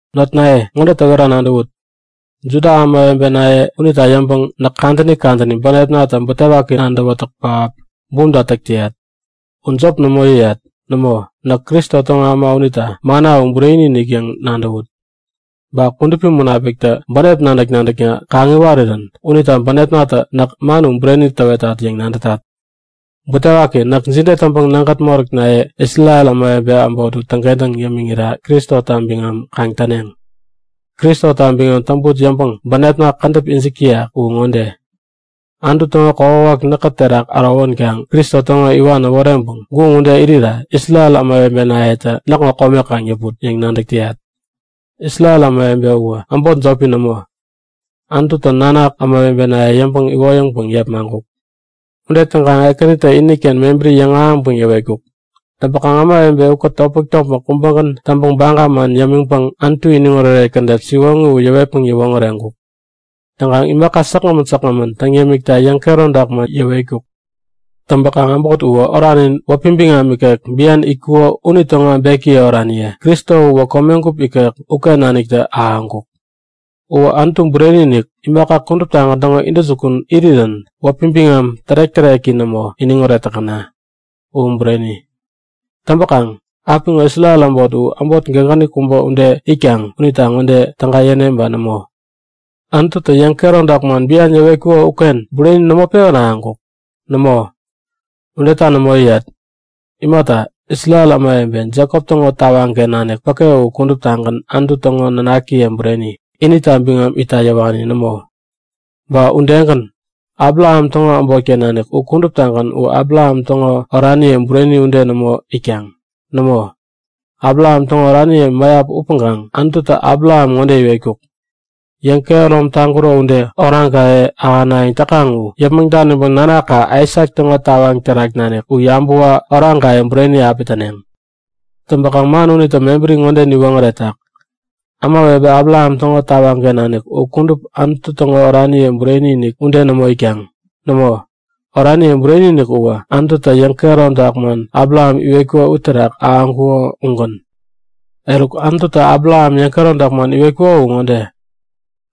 Notnaye, ŋode täwera nadäwut; Juda ämawebenaye unita yäŋpäŋ näk kadäni kadäni bänepnatä butewaki nadäwätäk pähap bumta täk täyat. U jop nämo yäyat. Nämo, näk Kristo täŋo äma unita manna u bureni-inik yäŋ nadäwut. Ba Kudupi Munapiktä bänep nadäk-nadäkna kaŋ-iwarirän unita bänepnatä näk man bureni täwetat yäŋ nadätat. Butewaki! Näk jide täŋpäŋ nägät moräknaye, Isrel ämawebe äbot u täŋkentäŋ yämiŋira Kristota biŋam kaŋ täneŋ? Kristota biŋam täŋput yäŋpäŋ bänepna kädäp ijik täyak u ŋode; Anutu täŋo kokwawak näkä terak ärowänkaŋ Kristo täŋo iwan äworeŋpäŋ guŋ ude irira Isrel ämawebenayetä näkŋo kome kaŋ yäput! yäŋ nadäk täyat. Isrel ämawebe uwä äbot jopi nämo, Anututä nanak ämawebenaye yäŋpäŋ iwoyäŋpäŋ yepmaŋkuk. Ude täŋkaŋ Ekänitä iniken mebäri yäŋahäŋpäŋ yäwetkuk. Täŋpäŋ ämawebe ukät topmäk-topmäk kubägän täŋpäŋ baga man yämiŋpäŋ Anutu iniŋoret kädet siwoŋi u yäwetpäŋ yäwoŋäreŋkuk. Täŋkaŋ imaka säkgämän säkgämän täŋ yämikta yäŋkehäromtak man yäwetkuk. Täŋpäkaŋ äbot uwä oranin wäpi biŋam ikek bian itkuŋo unitäŋo äbekiye oraniye. Kristo uwä komegup ikek uken naniktä ahäŋkuk. Uwä Anutu bureni-inik, imaka kuduptagän täŋo intäjukun irirän wäpi biŋam tärek-täreki nämo iniŋoret täkäna! U Bureni! Täŋpäkaŋ apiŋo Isrel äbot u äbot gägäni kubä ude itkaŋ unita ŋode täga yäne ba nämo? Anututä yäŋkehäromtak man bian yäwetkuko uken bureni nämo pewän ahäŋkuk? Nämo, udeta nämo yäyat! Imata, Isrel ämawebe, Jekop täŋo tawaŋken nanik päke u kuduptagän Anutu täŋo nanakiye bureni, inita biŋam itta yäwani nämo. Ba udegän, Abraham täŋo äbotken nanik u kudup u Abraham täŋo oraniye bureni ude nämo itkaŋ. Nämo, Abraham täŋo oraniye mäyap upäŋkaŋ Anututä Abraham ŋode iwetkuk; Yäŋkehärom taŋkuro ude, oraŋkaye ahänayäŋ täkaŋ u yäpmäŋ daniŋpäŋ nanaka Aisak täŋo tawaŋ terak nanik u yabäwa oraŋkaye bureni api täneŋ. Täŋpäkaŋ man unitä mebäri ŋode niwoŋäretak; Ämawebe Abraham täŋo tawaŋken nanik u kudup Anutu täŋo oraniye bureni-inik ude nämo itkaŋ. Nämo, oraniye bureni-inik uwä Anututä yäŋkehäromtak man Abraham iwetkuko uterak ahäŋkuŋo ugän. Eruk Anututä Abraham yäŋkehäromtak man iwetkuko u ŋode;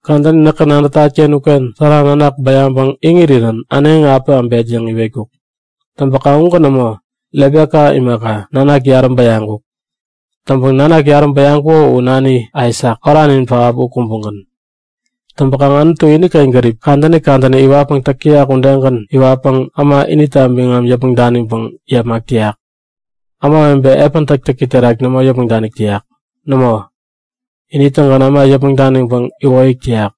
Kadäni näkä nadätat-ken uken Sara nanak bäyaŋpäŋ iŋirirän äneŋi api äbet yäŋ iwetkuk. Täŋpäkaŋ ugän nämo. Rebeka imaka, nanak yarä bäyaŋkuk. Täŋpäŋ nanak yarä bäyaŋkuko u nani Aisak, oranin pähap u kubägän. Täŋpäkaŋ Anutu iniken gärip kadäni kadäni iwatpäŋ täk täyak udegän iwatpäŋ äma inita biŋam yäpmäŋ daniŋpäŋ yepmak täyak. Ämawebe epän täktäki terak nämo yäpmäŋ danik täyak. Nämo, ini-tägän äma yäpmäŋ daniŋpäŋ iwoyäk täyak.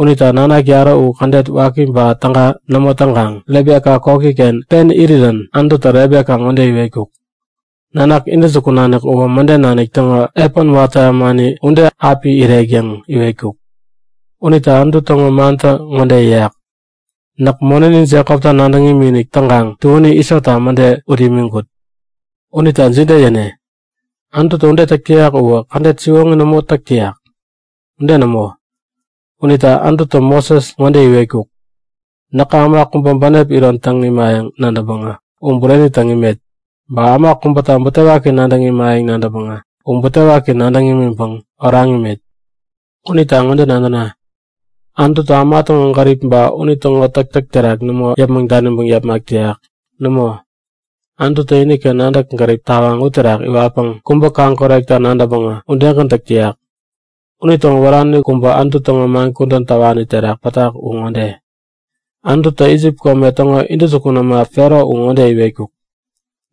Unita nanak yarä u kädet waki ba täga nämo täŋkaŋ Rebeka koki-ken pen irirän Anututä Rebeka ŋode iwetkuk; Nanak intäjukun nanik uwä mäden nanik täŋo epän watä ämani ude api irek yäŋ iwetkuk. Unita Anutu täŋo mantä ŋode yäyak; Näk monäni Jekopta nadäŋ imikinik täŋkaŋ tuäni Isota mäde ut imiŋkut. Unita jide yäne? Anututä ude täk täyak uwä kädet siwoŋi nämo täk täyak? Ude nämo! Unita Anututä Moses ŋode iwetkuk; Näkä äma kubäta bänep iron täŋ imayäŋ nadäŋpäŋä u bureni täŋ imet. Ba äma kubäta butewaki nadäŋ imayäŋ nadäŋpäŋä u butewaki nadäŋ imiŋpäŋ oraŋ imet. Unita ŋode nadäna; Anututä äma täŋo gärip ba unitäŋo täktäk terak nämo yäpmäŋ daniŋpäŋ yepmak täyak. Nämo, Anututä iniken nadäk-gärip tawaŋ uterak iwatpäŋ kubä kaŋ-korekta nadäŋpäŋä udegän täk täyak. Unitäŋo wärani kubä Anutu täŋo man kudän täwani terak pätak u ŋode; Anututä Isip kome täŋo intäjukun äma Fero ŋode iwetkuk;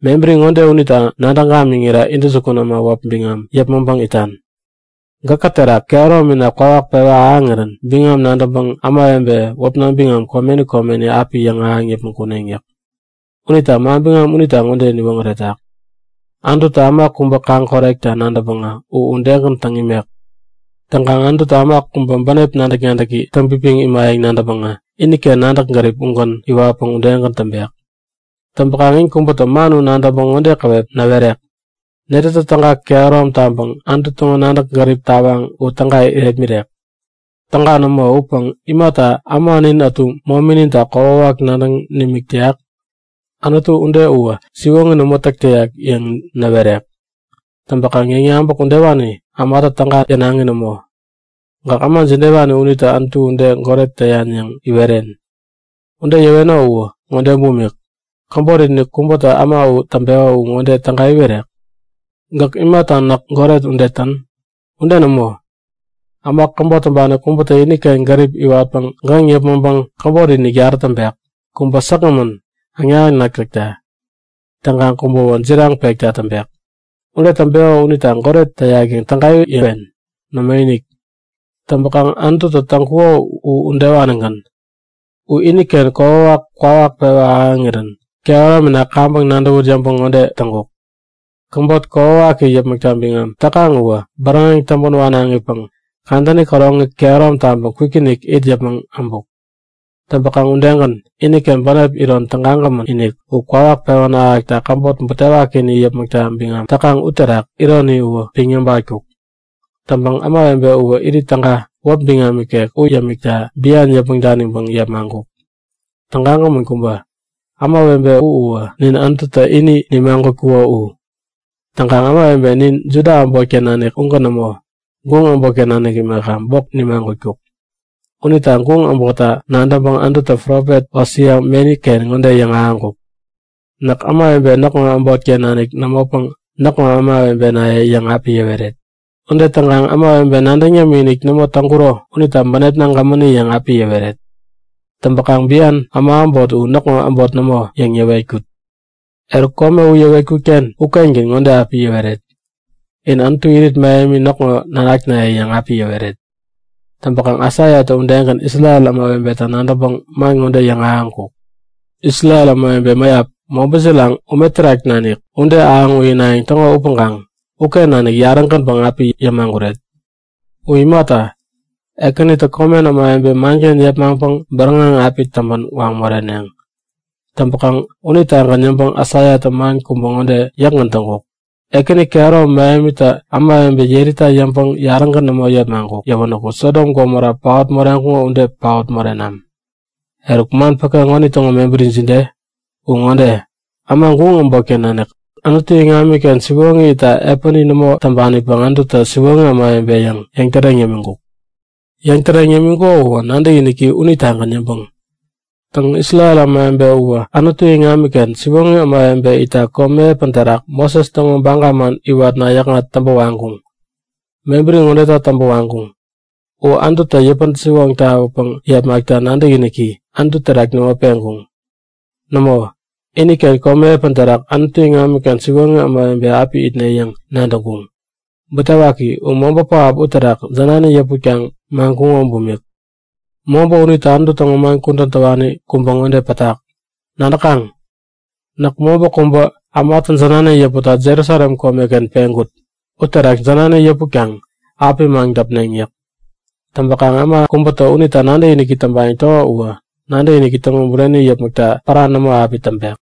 Mebäri ŋode unita nadäŋ gamiŋira intäjukun äma wäp biŋam yäpmäŋpäŋ itan; Gäkä terak kehäromina kwawak pewa ahäŋirän biŋam nadäŋpäŋ ämawebe wäpna biŋam komeni komeni api yäŋahäŋ yäpmäŋ kuneŋ yäk. Unita manbiŋam unitä ŋode niwoŋäretak; Anututä äma kubä kaŋ-korekta nadäŋpäŋä u udegän täŋ imek. Täŋkaŋ Anututä äma kubä bänep nadäk-nadäki täŋpipiŋ imayäŋ nadäŋpäŋä iniken nadäk-gärip ugän iwatpäŋ udegän täŋpek. Täŋpäkaŋ in kubätä man u nadäŋpäŋ ŋode käwep näwerek; Netätä täga kehärom taŋpäŋ Anutu täŋo nadäk-gärip tawaŋ u täga irepmirek? Täga nämo upäŋ imata äma nin ätu momininta kokwawak nadäŋ nimik täyak? Anutu ude uwä siwoŋi nämo täk täyak yäŋ näwerek. Täŋpäkaŋ yäŋyabäk udewani ämatä täga yänaŋi nämo. Gäk äma jidewani unita Anutu ude goret täyan yäŋ iweren? Ude yäweno u ŋode bumik; Käbotinik kubätä äma u täŋpeko u ŋode täga iwerek? Gäk imata näk goret ude tän? Ude nämo! Äma käbot täŋpani kubätä iniken gärip iwatpäŋ gäŋ yäpmäŋpäŋ käbotinik yarä täŋpek. Kubä säkgämän, äŋnak-äŋnak täkta. Täŋkaŋ kubäwä jiraŋ pekta täŋpek. Ude täŋpeko unita goret täyak yäŋ täga yäwen? Nämoinik! Täŋpäkaŋ Anututä täŋkuko u udewanigän. U iniken kokwawak kwawak pewa ahäŋirän kehäromina kaŋpäŋ nadäwut yäŋpäŋ ŋode täŋkuk; Käbot kokwawaki yäpmäkta biŋam täkaŋ uwä bäräŋeŋ täŋpän wanaŋipäŋ kadäni käroŋi kehärom taŋpäŋ kwikinik it yäpmäŋ äbuk. Täŋpäkaŋ udegän, iniken bänep iron tägagämän-inik u kwawak pewän ahäkta käbot butewakini yäpmäkta biŋam täkaŋ uterak ironi u piŋ yäbatkuk. Täŋpäŋ ämawebe uwä irit täga, wäp biŋam ikek u yämikta bian yäpmäŋ daniŋpäŋ yepmaŋkuk. Tägagämän kubä! Ämawebe u uwä nin Anututä ini nimagutkuko u. Täŋkaŋ ämawebe nin Juda äbotken nanik ugän nämo, guŋ äbotken nanik imaka, bok nimagutkuk. Unita guŋ äbotta nadäŋpäŋ Anututä profet Hosea meni-ken ŋode yäŋahäŋkuk; Näk ämawebe näkŋo äbotken nanik nämopäŋ Näkŋo ämawebenaye yäŋ api yäweret. Ude täŋkaŋ ämawebe nadäŋ yämikinik nämo täŋkuro unita bänepna gämäni yäŋ api yäweret. Täŋpäkaŋ bian äma äbot u Näkŋo äbot nämo yäŋ yäwetkut. Eruk kome ude yäwetkut-ken ukengän ŋode api yäweret; In Anutu irit mähemi näkŋo nanaknaye yäŋ api yäweret. Täŋpäkaŋ Aisaiatä udegän Isrel ämawebeta nadäŋpäŋ man ŋode yäŋahäŋkuk; Isrel ämawebe mäyap, mobä jiraŋ ume terak nanik ude ahäŋ uyinayäŋ täŋo upäŋkaŋ uken nanik yarä-gänpäŋ api yämaguret. U imata, Ekänitä komen ämawebe manken yepmaŋpäŋ bäräŋeŋ api täŋpän waŋ moreneŋ. Täŋpäkaŋ unitagän yäŋpäŋ Aisaiatä man kubä pen ŋode yäkgän täŋkuk; Ekäni kehäromi mähemitä ämawebe yerita yäŋpäŋ yarägän nämo yepmaŋkuk yäwänä Sodom Gomora paot moreŋkuŋo ude paot morenam. Eruk man päke ŋonitäŋo mebäri jide? U ŋode; Äma guŋ äbotken nanik Anutu iŋamiken siwoŋi itta epäni nämo täŋpanipäŋ Anututä siwoŋi ämawebe yäŋ yäŋtäreŋ yämiŋkuk. Yäŋtäreŋ yämiŋkuko uwä nadäkiniki unitagän yäŋpäŋ. Täŋ, Isrel ämawebe uwä Anutu iŋamiken siwoŋi ämawebe itta komi epän terak Moses täŋo baga man iwatna yäkŋat täŋpä waŋkuŋ. Mebäri ŋodeta täŋpä waŋkuŋ; U Anututä yäpän-siwoŋ tawäpäŋ yepmaŋpekta nadäkiniki Anutu terak nämo peŋkuŋ. Nämo, iniken komi epäni uterak Anutu iŋamiken siwoŋi ämawebe api itne yäŋ nadäŋkuŋ. Butewaki, u mobä pähap uterak jänani yäputkaŋ maŋkuŋo bumik. Mobä unita Anutu täŋo man kudän täwani kubä ŋode pätak; Nadäkaŋ? Näk mobä kubä ämatä jänani yäputta Jerusalem komeken peŋkut. Uterak jänani yäputkaŋ api maŋdäpneŋ yäk. Täŋpäkaŋ äma kubätä unita nadäkinik täŋpayäŋ täko uwä nadäkiniki täŋo bureni yäpmäkta pära nämo api täŋpek.